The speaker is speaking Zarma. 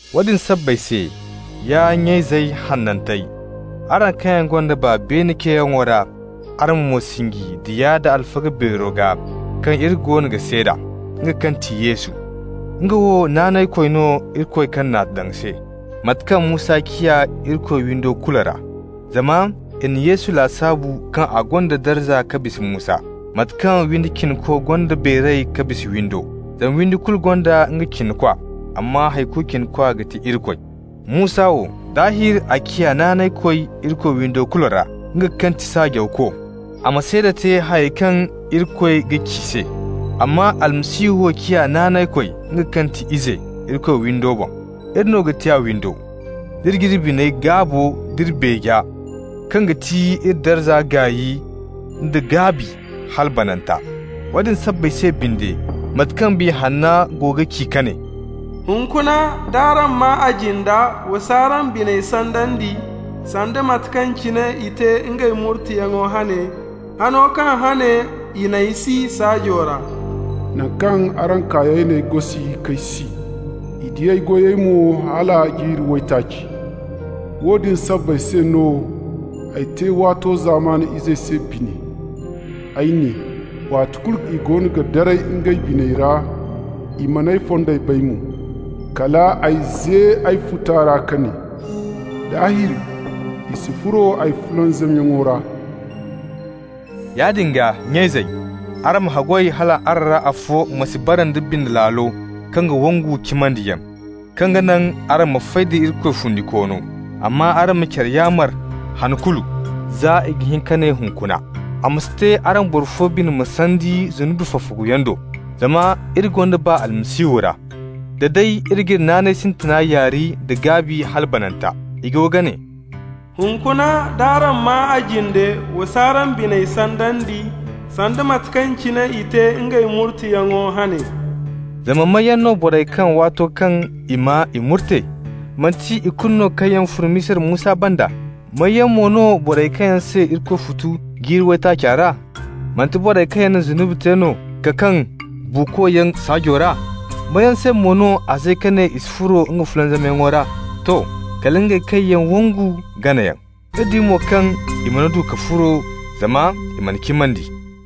Woodin sabbay se, ya nya-izey hanantey, araŋ kaŋ yaŋ gonda baa beene ceeyaŋo ra, araŋ ma mo sinji Diya da Alfaga Beero gaa kaŋ iri goono ga seeda, nga kaŋ ti Yesu. Nga wo naanaykoy no Irikoy kaŋ n'a daŋ se, mate kaŋ Musa ciya Irikoy windo kulu ra. Zama i na Yesu lasaabu kaŋ a gonda darza ka bisa Musa, mate kaŋ windi cinako gonda beeray ka bisa windo. Zama windi kulu gonda nga cinakwa, amma hay kulu cinakwa ga ti Irikoy. Musa wo, daahir a ciya naanaykoy Irikoy windo kulu ra, nga kaŋ ti saajawko, a ma seeda te hayey kaŋ Irikoy ga ci se. Amma Almasihu wo ciya naanaykoy, nga kaŋ ti Ize, Irikoy windo boŋ. Iri no ga ti a windo, d'iri g'iri bine-gaabo d'iri beeja kaŋ ga ti iri darza gaay nda gaabi hala bananta. Woodin sabbay se binde, mate kaŋ Biya Hanna go ga ci ka ne: «Hunkuna, d'araŋ maa a jinda, wa s'araŋ biney sandandi, sanda mate kaŋ cine i te ngey murteyaŋo hane, hano kaŋ hane i n'ay si saajo ra. Naŋ kaŋ araŋ kaayey n'ay gosi k'ay si, i di ay goyey mo hala jiiri waytaaci. Woodin sabbay se no ay te waato zamana izey se bine. Ay ne: ‹Waati kulu i go ga daray ngey biney ra, I man'ay fondey bay mo.› Kal ay ze ay futa ra ka ne: ‹Daahir i si furo ay fulanzamyaŋo ra.›» Yaadin gaa, nya-izey, araŋ ma haggoy hal araŋ ra afo ma si bara nda bine laalo kaŋ ga wangu cimandiyaŋ, kaŋ ga naŋ araŋ ma fay da Irikoy fundikoono. Amma araŋ ma care yaamar han kulu, za i ga hin ka ne Hunkuna. A ma si te araŋ boro fo bine ma sandi zunubi fafaguyaŋ do. Zama iri gonda baa Almasihu ra, da day iri g'iri naanay sintina yaari nda gaabi hala bananta. I go ga ne: «Hunkuna, d'araŋ maa a jinde, wa s'araŋ biney sandandi, sanda mate kaŋ cine i te ngey murteyaŋo hane.» Zama may yaŋ no borey kaŋ, waato kaŋ i maa, i murte? Manti ikulu no kaŋ yaŋ fun Misira Musa banda? May yaŋ mo no borey kaŋ se Irikoy futu jiiri waytaaca ra? Manti borey kaŋ yaŋ na zunubi te no ka kaŋ buukoyaŋ saajo ra? May yaŋ se mo no a ze ka ne i si furo nga fulanzamyaŋo ra? To, kala ngey kaŋ yaŋ wangu ganayaŋ. Iri di mo kaŋ i mana du ka furo, zama i man'a cimandi.